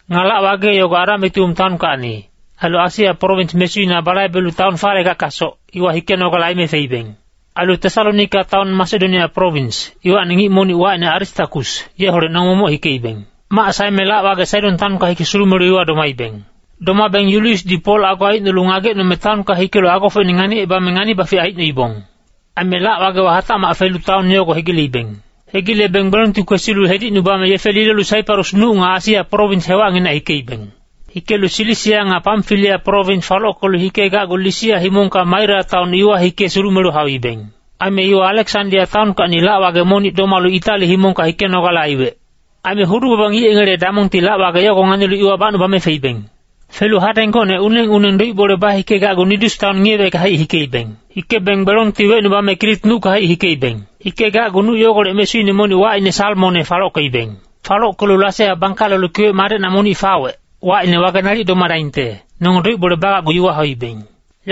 Nga lac-wage yogo Adamitium taonkacni, ailu Asia prowins mesuina balaibelu taon falegackasoc, iwa hikenogale aime feibeng. Ailu Tesalonika taon Masedonia prowins, iwacni ngic monic wacine Aristakus, yeholec nonge momoc hikeibeng. Mac saeme lac-wage Saidon taonka hike sulumelu iwa domaibeng. Domabeng Yuliusdi Pol ago aicnolu ngagecnome taonka hikelu agofocine nganicebame ngani-bafic aicnoibong. Aime lac-wagewa hatacmac felu taon yogo hegileibeng. Hegilebeng gbelongti kwesilu hedicnubame yefe lilolu Saiparus nuc nga Asia prowins hewacnginac hikeibeng. Hikelu Silisia nga Pamfilia prowins falockelu hikegacgu Lisia himongka Maira taon iwa hike sulumelu hauibeng. Aime iwa Aleksandia taonkacni lac-wage monic domalu Itali himongka hikenogale aiwec. Aime hudu-baba ngic yengele damongti lac-wage yogo nganilu iwa bacnubame feibeng. Felu hadeng gocne uneng-uneng doic-bole bahikecgu Nidus taon ngiyewecka-haic hikeibeng. Hikebeng gbelongti wecnubame Krit nucka-haic hikeibeng. Hikegacgu nuc yogolec mesuine monic wacine Salmone falockeibeng. Falockelu Lasea bangkalelu kiwec madecna monic fawec, wacine Wage Nalic Domadaingte, nonge doic-bole bagacgu iwa hauibeng.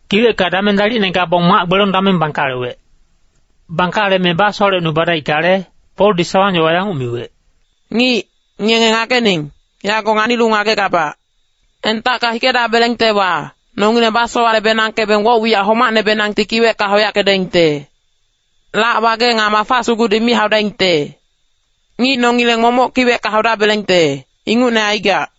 Kiwecka dameng dalicne gabong mac-gbelong dameng bangkalewec. Bangkaleme basowalecnubadaickale, Poldi sawang-yowa yanguc miwec, “Ngic, ngenge ngagening, yago nganilu ngagegabac. Entacka hikedabelengtewa, nongileng basowale-benangkebeng woc-wiyac homacnehacbenangti kiwecka hauyackedaingte. Lac-wage nga mafa sugudi mi haudaingte. Ngic nongileng momoc kiwecka haudabelengte, ingucne aigac.”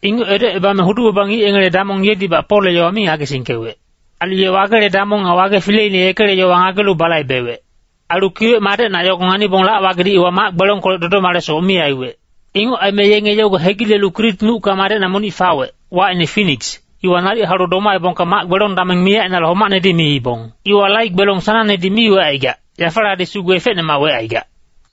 Inguc edocebame hudu-baba ngic yengele damong yedibac Polle yowa mi ngagesingkewec. Ailu ye wagele damong nga wage fileine yekele yowa ngagelu balaibewec. Ailu kiwec madecna yogo nganibong lac-wagedi iwa mac-gbelongkolec dodomalesoc mi aiwec. Inguc aime yenge yogo hegilelu Krit nucka madecna monic fawec, wacine Finiks, iwa nalic haulu domaebongka mac-gbelong dameng miyac ainale homacnedi miibong. Iwa lai gbelong sanangnedi mi wecaigac, yafaladi sugu efecnemac wecaigac.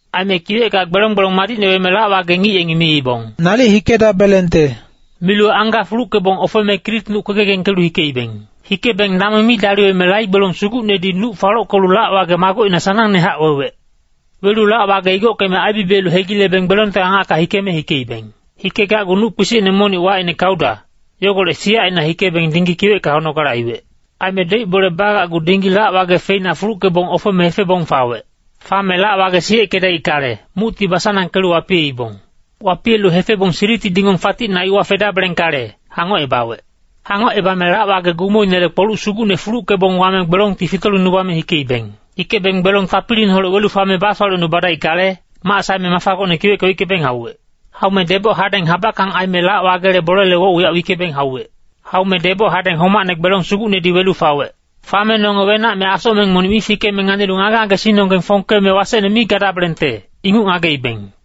Aime kiwecka gbelong gbelong madicne weme lac-wage ngic yengi miibong, “Nalic hikedabelengte.” Milu angga fuluckebong ofeme Krit nuc kwegegengkelu hikeibeng. Hikebeng dameng mi daliweme lai gbelong sugucnedi nuc falockelu lac-wage magocina sanangnehac wewec. Welu lac-wage igockeme aibibiyelu hegilebeng gbelongte angacka hikeme hikeibeng. Hikegacgu nuc kpisicne monic wacine Kauda, yogolec siyacina hikebeng dinggi kiwecka haunogale aiwec. Aime doic-bole bagacgu dinggi lac-wage feina fuluckebong ofeme hefebong fawec. Fame lac-wage siyeckedaickale, mucti basanangkelu wapiyeibong. Wapiyelu hefebong Siriti dingong faticna iwa fedabelengkale, hangocebawec. Hangocebame lac-wage gumoinele kpoluc sugucne fuluckebong wame gbelongti fitolingnubame hikeibeng. Hikebeng gbelong tapiliineholec welu fame basowalecnubadaickale, mac saeme mafa gocne kiwecka wickebong hauwec. Haume deboc hadeng habackang aime lac-wagele bolele woc-wiyac wickebong hauwec. Haume deboc hadeng homacne gbelong sugucnedi welu fawec. Fame nonge wenac me asocmeng monic mi fikeme nganilu ngage-ngagesingnonggeng fongkeme wasecne mi gadabelengte, inguc ngageibeng.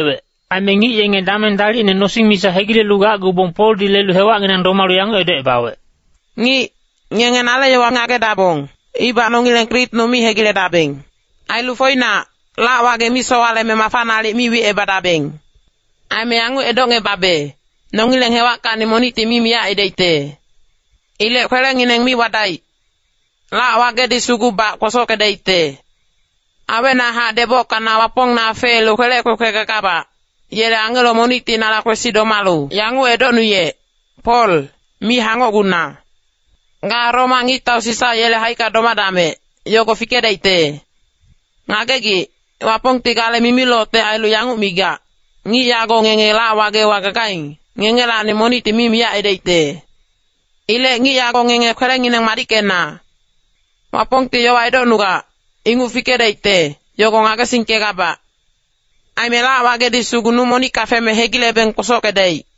Aime ngic yenge dameng dalicne nosing misa hegilelu gacgubong Poldi lelu hewacnginang domalu yanguc edocebawec, “Ngic, ngenge nale yowa ngagedabong, ibac nongileng Krit nuc mi hegiledabeng. Ailu foinac, lac-wage mi sowaleme mafa nalic mi wicebadabeng. Aime yanguc edocngebabe, nongileng hewackacni monicti mi miyac aidaicte. Ilec kwelengineng mi wadaic. Lac-wagedi sugubac kwosockedaicte. Awecnahac debocka na Wapongne afeelu kwelec kwekwe gagabac, yele angelo monicti nala kwesi domalu yanguc edocnuyec, ‘Pol, mi hangocguna. Ga Roma ngictau Sisa yele haicka domadamec, yogo fikedaicte.’ Ngagegic, Wapongti gale mimilocte ailu yanguc migac, ‘Ngic yago ngenge lac-wagewa gagaing, ngengelacni monicti mi miyac aidaicte.’ Ilec ngic yago ngenge kwelengineng madickena. Wapongti yowa edocnugac, inguc fikedaicte, yogo ngagesingkegabac. Aime lac-wagedi sugu nuc monicka feme hegilebeng kwosockedaic.”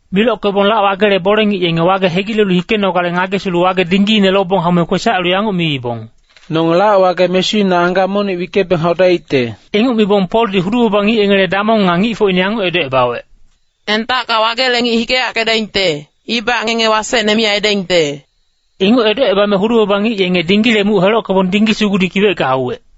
Milockebong lac-wagele bole-ngic yenge wage hegilelu hikenogale ngagesilu wage dinggiine lobong haume kwesac ailu yanguc miibong, “Nonge lac-wage mesuina angga monic wickebeng haudaicte.” Inguc mibong Poldi hudu-baba ngic yengele damong nga ngicfocine yanguc edocebawec, “Entacka wagele ngic hikeyackedaingte, ibac ngenge wasecne mi aidaingte.” Inguc edocebame hudu-baba ngic yenge dinggile muc helockebong dinggi sugudi kiwecka hauwec.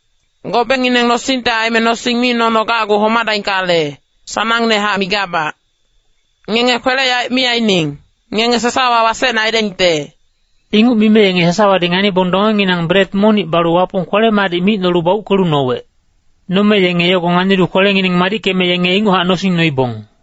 Gobengineng nosingte aime nosing mi nono gacgu homadaingkale, sanangnehac migabac. Ngenge kwele-yaec mi aining, ngenge sasawa wasecne aidaingte.” Inguc mime yenge sasawadi nganibong dongenginang bret monic balu Wapong kwele-madic micnolu bauckelu nowec. Nome yenge yogo nganilu kwelengineng madickeme yenge inguchac nosing noibong.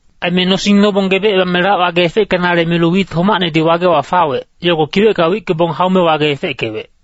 Aime nosing nobong gebecebame lac-wage efeckenale milu wit homacnedi wagewa fawec, yogo kiwecka wickebong haume wage efeckewec.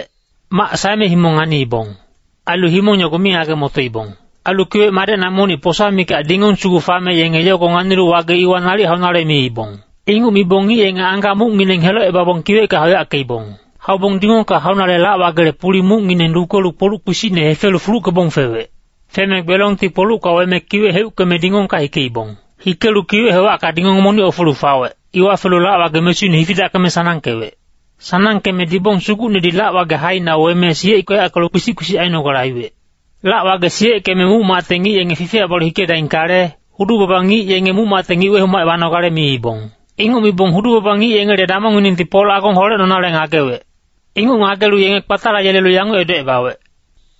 Mac saeme himong nganiibong. Ailu himong yogo mi ngage-motoibong. Ailu kiwec madecna monic posa mikac dingong sugu fame yenge yogo nganilu wage iwa nalic haunale miibong. Inguc mibong ngic yenge angga mucngineng helocebabong kiwecka hauyackeibong. Haubong dingongka haunale lac-wagele puli mucngineng lukelu kpoluc kpisicne hefelu fuluckebong fewec. Feme gbelongti kpolucka weme kiwec heuckeme dingongka hikeibong. Hikelu kiwec hewacka dingong monic ofelu fawec, iwa felu lac-wage mesuine hifidackeme sanangkewec. Sanangkeme dibong sugucnedi lac-wage haine weme siyeckeyackelu kpisic-kpisic ainogale aiwec. Lac-wage siyeckeme muc-macte ngic yenge fifiyac balu hikedaingkale, hudu-baba ngic yenge muc-macte ngic wehomacebanogale miibong. Inguc mibong hudu-baba ngic yengele damongnginengti Pol agong holecnonale ngagewec. Inguc ngagelu yenge kpatalayelelu yanguc edocebawec,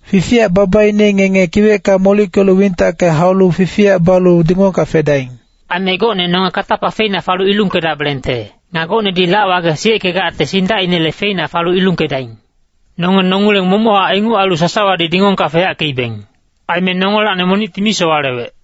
“Fifiyac babaine ngenge kiwecka molickelu wintacke haulu fifiyac balu dingongka fedaing. Aime gocne nonge katapa feina falu ilungkedabelengte, nga gocnedi lac-wage siyeckegacte sindacinele feina falu ilungkedaing.” Nonge nongileng momochac inguc ailu sasawadi dingongka feyackeibeng. Aime nongelacni monicti mi sowalewec.